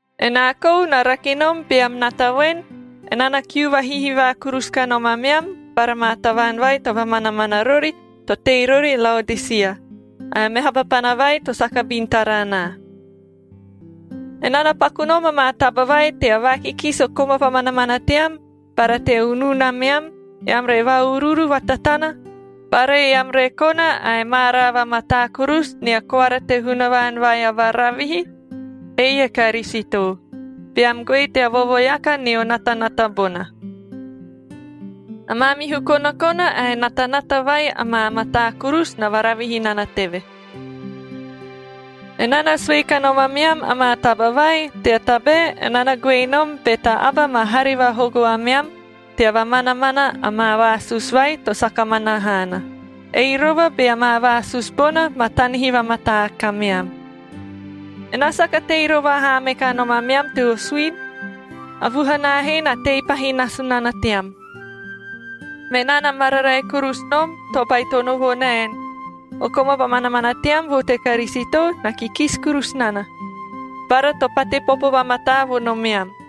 Enaa kou na rake nom beam nata voen, enaa na kiu vahihivaa kurusu kanom ameam bara maa tavaan vai to vamanamana rori, to tei rori Laodisia, ae a meha papana vai to saka bin tara anaa. Enaa na paku nom amaa taba vai tea vaakikisi o koma vamanamana team bara tea unun ameam, eam re va-uruuru vatatana bara eam re kona ae maaraa vamataa kurusu nia koara te Hunavaan vai a varavihi, ei e Karisito, beam goe tea vovoeaka nio natanata bona. A maamihu konakona ae natanata vai amaa mataa kurusu na varavihi nana teve. Enaa na sue kanom ameam amaa taba vai, tea tabae enaa na goe nom be ta aba ma hare vahogo ameam tea vamanamana amaa vaasusu vai to saka mana haana, ei rova bea maa vaasusu bona ma tanihi vamataa kameam. Enaa saka tei rova haa me kanom ameam teo suini, a vuhanaa he na tei pahi nasu nana team. Menaa na mararae kurusu nom to baitono vo naen, o koma vamanamana team vo te Karisito na kikisi kurusu nana, bara to pate popo vamataa vo nomeam.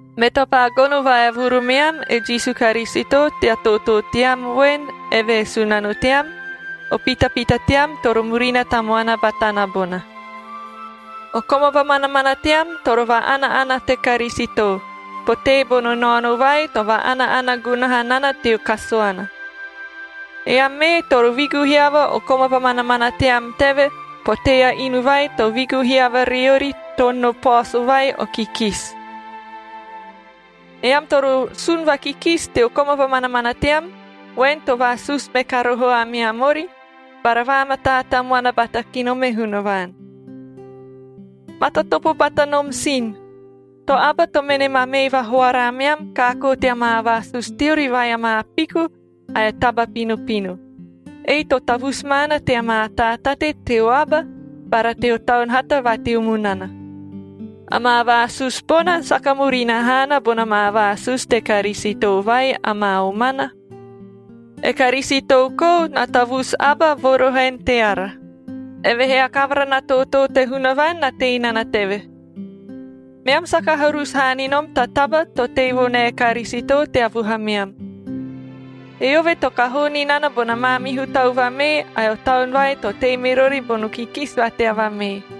Me to paa gono vaevuru meam e Jisu Karisito tea tootoo team voen, eve e Sunano team, o pitapita team toro murina tamuana batana bona. O koma vamanamana team toro va-ana-ana te Karisito, potee bono naono vai to va-ana-ana gunaha nana teo kasuana. Eam mee toro vigu hiava o koma vamanamana team teve, potee a inu vai to vigu hiava riori toono paoso vai o kikisi. Eam toro sun vakikisi teo koma vamanamana team, voen to vaasusu me ka roho ameam ori, bara vaamataa tamuana bata ki nom e Hunavaan. Matatopo bata nom sin, to aba to mene ma mee vahoara ameam kaakoo tea maa vaasusu teori vai amaa piku ae taba pinopino, ei to tavusu maana tea maa taatate teo aba bara teo taun hata va teo munana. Amaa vaasusu bona saka murina haana bona maa vaasusu te Karisito vai amaa omana. E Karisito kou na tavusu aba vo roho en teara, evehee a kavara na tootoo te Hunavaan na tei nana teve. Meam saka harusu haa ni nom ta taba to tei vo nae Karisito tea vuhameam. Eove to kahoo ni nana bona maamihu tau vamee ae o taun vai to tei me rori bono kikisi va tea vamee.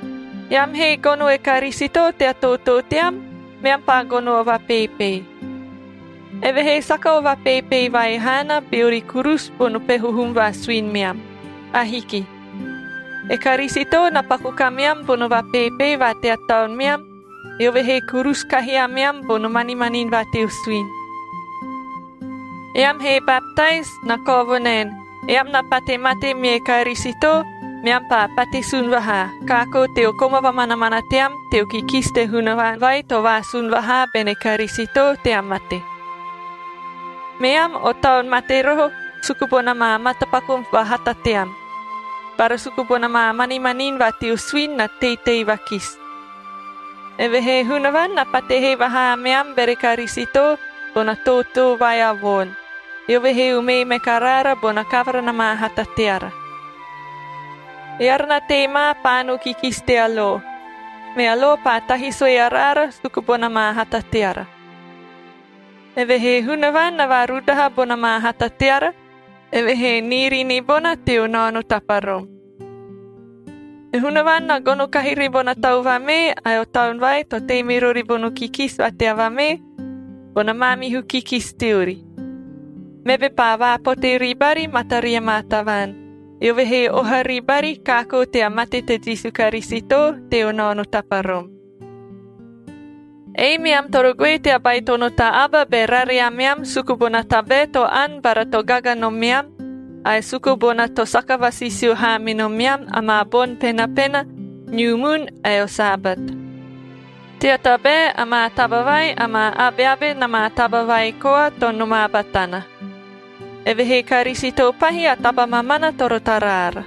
Eam he gono e Karisito tea tootoo team, meam paa gono o vapeepee. Evehee saka o vapeepee vai haana beori kurusu bono peho hum va suini meam. Ahiki. E Karisito na paku kameam bono vapeepee va tea taun meam, eove he kurusu kahi ameam bono manimanini va teo suini. Eam he baptais, na kao vo naen, eam na pate mate mie Karisito meam paa pate sun vahaa, kaakoo teo koma vamanamana team teo kikisi te Hunavaan vai to vaasun vahaa bene Karisito tea mate. Meam o taun mate roho suku bona maa matapaku vahata team, bara suku bona maa manimanini va teo suini na teitei vakisi. Evehee Hunavaan na pate hee vahaa ameam bere Karisito bona tootoo vai a voon, eove he umee me karaara bona kavara na maa hata teara. Eara na tei ma paano kikisi tea lo, mea lo paa tahi sue araara suku bona ma hata teara. Evehee Hunavaan na vaarudaha bona maa hata teara, eve he niiri ni bona teo naono taparom. E Hunavaan na gono kahi ribona tau vamee ae o taun vai to tei me rori bono kikisi va tea vamee, bona maamihu kikisi teori. Meve paa vaapote ribari mataria maa tavaan, eove he oha ribari kaakoo tea mate te Jisu Karisito teo naono taparom. Ei meam toro goe tea baitono ta aba be rare ameam suku bona tabae to ani bara to gaga nomeam ae suku bona to saka vasisio haa me nomeam amaa boni penapena, niu mun ae o Sabat. Tea tabae, amaa taba vai amaa abeabe na maa taba vai koa to nomaa batana. Evehee Karisito pahi a taba mamana toro tara ara.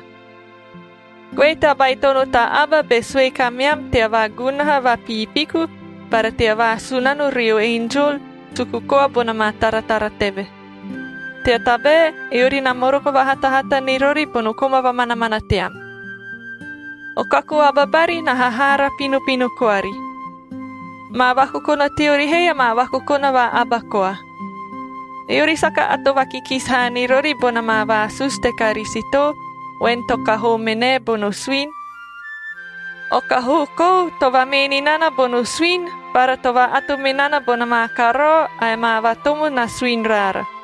Goe tea baitono ta aba be sue kameam tea vaagunaha vapiipiku bara tea vaasunano rio enjol suku koa bona maa taratara teve. Tea tabae, eori na moroko vahatahata ni rori bono koma vamanamana team. O kaku aba bari na hahaara pinopino koari. Amaa vakokona teori he, amaa vakokona va aba koa. Eori saka ato vakikisi haa ni rori bona maa vaasusu te Karisito, voen to kahoo me nae bono suini. O kahoo kou to vamee ni nana bono suini, bara to va-ato me nana bona maa karao ae amaa vatomo na suini raara,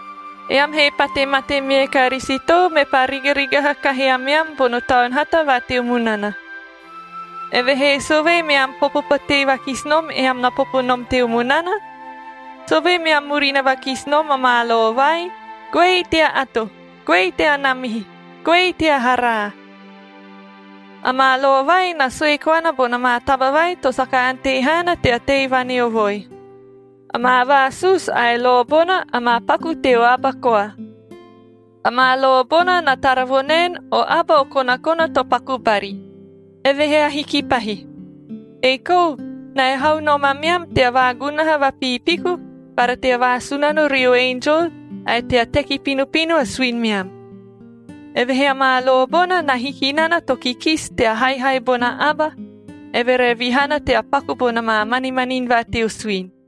Eam he pate mate mie Karisito, mepaa rigarigaha kahi ameam bono taun hata va teo munana. Evehee sovee meam popo potee vakisi nom, eam na popo nom teo munana? Sovee meam murina vakisi nom amaa lo vai, “Goei ta ato! Goei ta namihi! Goei ta haraa!”? Amaa lo vai na sue koana bona maa taba vai to saka ante haana tea tei vaneovoi. Amaa vaasusu ae lo bona amaa paku teo aba koa. Amaa lo bona na tara vo naen, o aba o konakona to paku bari, evehee ahiki pahi. Ei kou, na ehau koa nom ameam tea vaagunaha vapiipiku bara tea vaasunano rio enjol ae tea teki pinopino a suini meam. Evehee amaa lo bona na hiki nana to kikisi tea haihai bona aba, eve re vihana tea paku bona maa manimanini va teo suini.